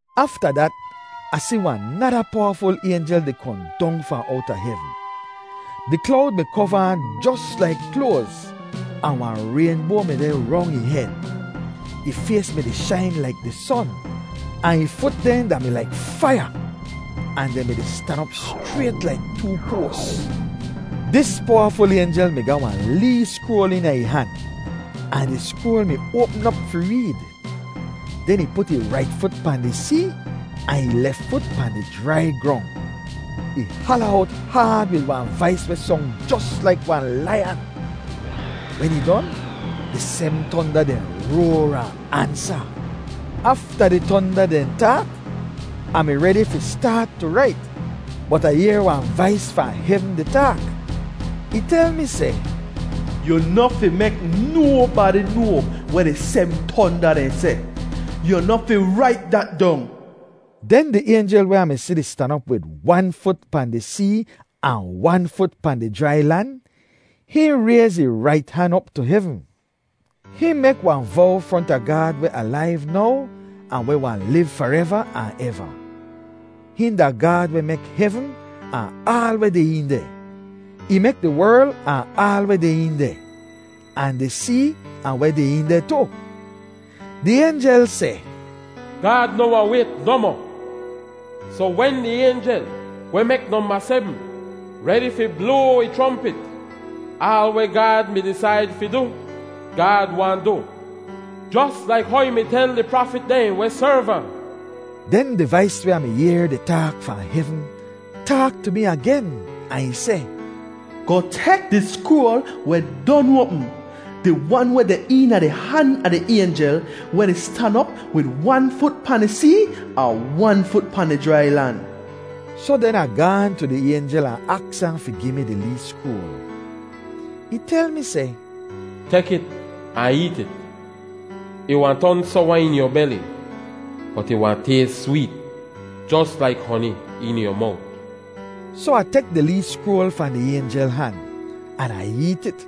Afta dat, Ah si wahn nada powaful aynjel di kohn dong fahn owta hevn. Di klowd mi kova ahn jos laik kloaz, ahn wahn raynboa mi deh rong ih hed. Ih fays mi-di shain laik di son, ahn ih fut dehn da-mi laik faiya ahn dehn mi-di stan op schrayt laik too poas. Dis powaful aynjel mi ga wahn lee skroal eena ih han, ahn di skroal mi oapm op fi reed. Den ih put ih rait fut pahn di see ahn ih lef fut pahn di jrai grong. Ih hala owt haad wid wahn vais weh song jos laik wahn laiyan. Wen ih don, di sebm tonda dehn roar ahn ansa. Afta di tonda dehn taak, Ah mi redi fi staat tu rait. Bot Ah yehr wahn vais fahn hevn di taak. Ih tel mi seh, “Yu noh fi mek nobadi noa weh di sebm tonda dehn seh. Yu noh fi rait dat dong.” Den di aynjel weh Ah mi si di stan op wid wan fut pahn di see ahn wan fut pahn di jrai lan, hihn rayz ih rait han op tu hevn. Hihn mek wahn vow fronta Gaad weh alaiv now ahn weh wahn liv fareva ahn eva. Hihn da Gaad weh mek hevn ahn aal weh deh een deh. Ih mek di werl ahn aal weh dehn een deh, ahn di see ahn weh deh een deh tu. Di aynjel seh, “Gaad noh wahn wayt nohmoh! Soh wen di aynjel weh mek nomba sebm redi fi bloa ih chrompit, aal weh Gaad mi disaid fi du, Gaad wahn du, jos laik how ih mi tel di prafit dehn weh serv ahn.” Den di vais weh Ah mi yehr di taak fahn hevn, taak tu mi agen ahn ih seh, “Goh tek di skroal weh don oapm, di wan weh deh eena di han a di aynjel weh di stan op wid wan fut pahn di see ahn wan fut pahn di jrai lan.” Soh den Ah gaahn tu di aynjel ahn aks ahn fi gi mi di lee skroal. Ih tel mi seh, “Tek it ahn eet it. Ih wahn ton sowa eena yu beli, bot ih wahn tays sweet jos laik honi eena yu mowt.” Soh Ah tek di lee skroal fahn di aynjel han, an Ah eet it.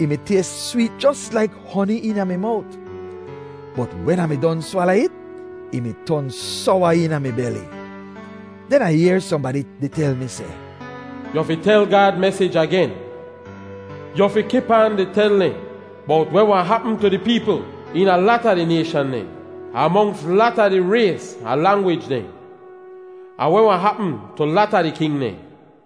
Ih mi tays sweet jos laik honi eena mi mowt. Bot wen Ah mi don swala it, ih mi ton sowa eena mi beli. Den Ah yehr sohnbadi di tel mi seh, “Yu fi tel Gaad mesij agen. Yu fi kip aan di tel dehn bowt weh wahn hapm tu di peepl eena lata di nayshan dehn, ahn monks lata di rays ahn langwij dehn, ahn weh wahn hapm tu lata di king dehn.”